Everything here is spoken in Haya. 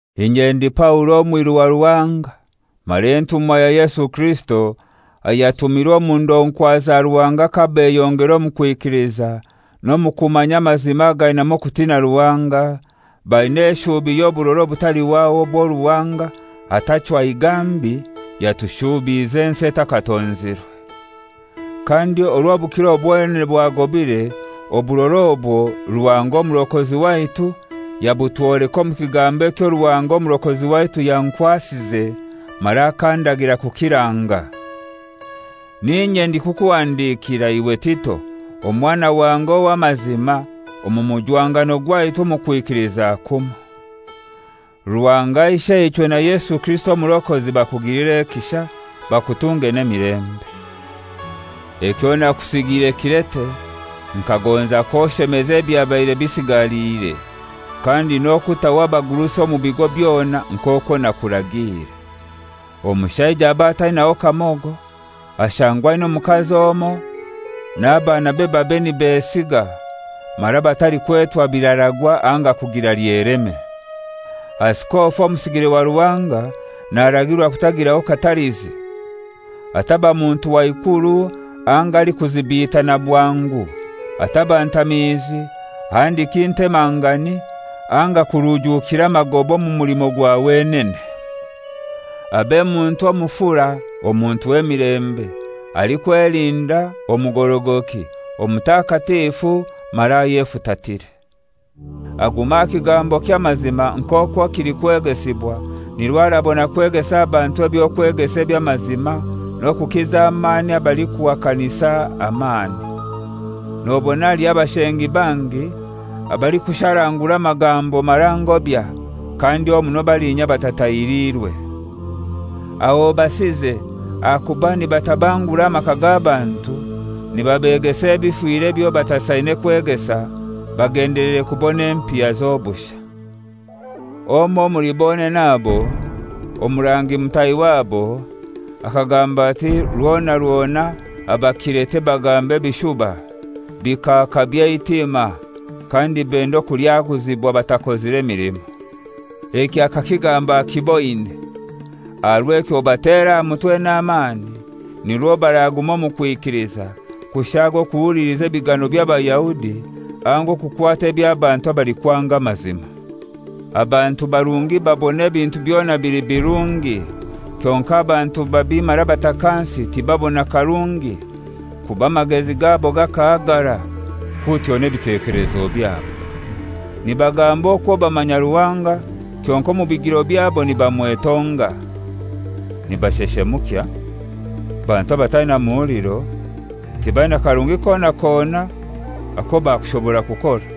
Inye ndi Paulo, omwiru wa Ruhanga mara entumwa ya Yesu Kirisito, ayatumirwe omu ndonkwa za Ruhanga kabeyongera omu kwikiliza n'omu kumanya amazima againamu okutina Ruhanga, baina eshuubi y'oburora obutalihwaho obwo Ruhanga, atachwa igambi yatushuubize ensi etakatonzirwe. Kandi orw'obukiro bwonene bwagobire, oburora obwo Ruhanga Omurokozi waitu yabutwoleka omu kigambo ekyo Ruhanga Omurokozi waitu yankwasize mara akandagira kukiranga: N'inye ndikukuhandikira, iwe Tito, omwana wange ow'amazima omu mujwangano gwaitu omu kwikiliza kumoi. Ruhanga Isheichwe na Yesu Kirisito Omurokozi bakugilire ekisha, bakutunge n'emilembe. Ekyo nakusigiire Kirete nkagonza k'oshemeza ebyabaire bisigaliire, kandi n'okutaho abagurusi omu bigo byona nk'okwo nakuragiire. Omushaija abe atainaho kamogo, ashangwe aina omukazi omoi, n'abaanabe babe nibesiiga, mara batalikwetwa biraragwa anga kugira lyeleme. Asikofu, omusigire wa Ruhanga, naragirwa kutagiraho katalizi. Ataba muntu wa ikuru anga alikuzibiitana bwangu, ataba ntamiizi handiki ntemangani anga kurujuukira magoba omu mulimo gwa wenene. Abe muntu omufura, omuntu w'emilembe, alikwelinda, omugorogoki, omutakatifu mara ayefutatire. Agume aha kigambo ky'amazima nk'okwo kilikwegesibwa, nirwo arabona kwegesa abantu eby'okwegesa eby'amazima n'okukiza amani abalikuhakanisa amani. Nobona haliho abashengi bangi, abalikusharangura amagambo mara ngobya, kandi omuno balinya abatatahiliirwe. Aho obasize, ahakuba nibatabangura amaka g'abantu nibabegesa ebifire ebyo batasaine kwegesa, bagendeleire kubona empiya z'obushai. Omoi omuli bonene abo, omurangi mutahi wabo, akagamba ati, «Rwona rwona Abakirete bagamba ebishuba, bikaaka by'eitima, kandi benda okulyaguzibwa batakozire milimo.» Eki akakigamba akiboine. Aha rw'ekyo obatere aha mutwe n'amani, nirwo baraguma omu kwikiliza, kushaaga okuhuliliza ebigano by'Abayahudi anga okukwata eby'abantu abalikwanga amazima. Abantu barungi babona ebintu byona bili birungi; kyonkai abantu babi mara batakansi tibabona karungi, kuba amagezi gabo gakahagara, kutyo n'ebitekelezo byabo. Nibagamba okwo bamanya Ruhanga, kyonkai omu bigiro byabo nibamwetonga. Nibasheshemukya, bantu abataina muhuliro, tibaina karungi kona kona ako bakushobora kukora.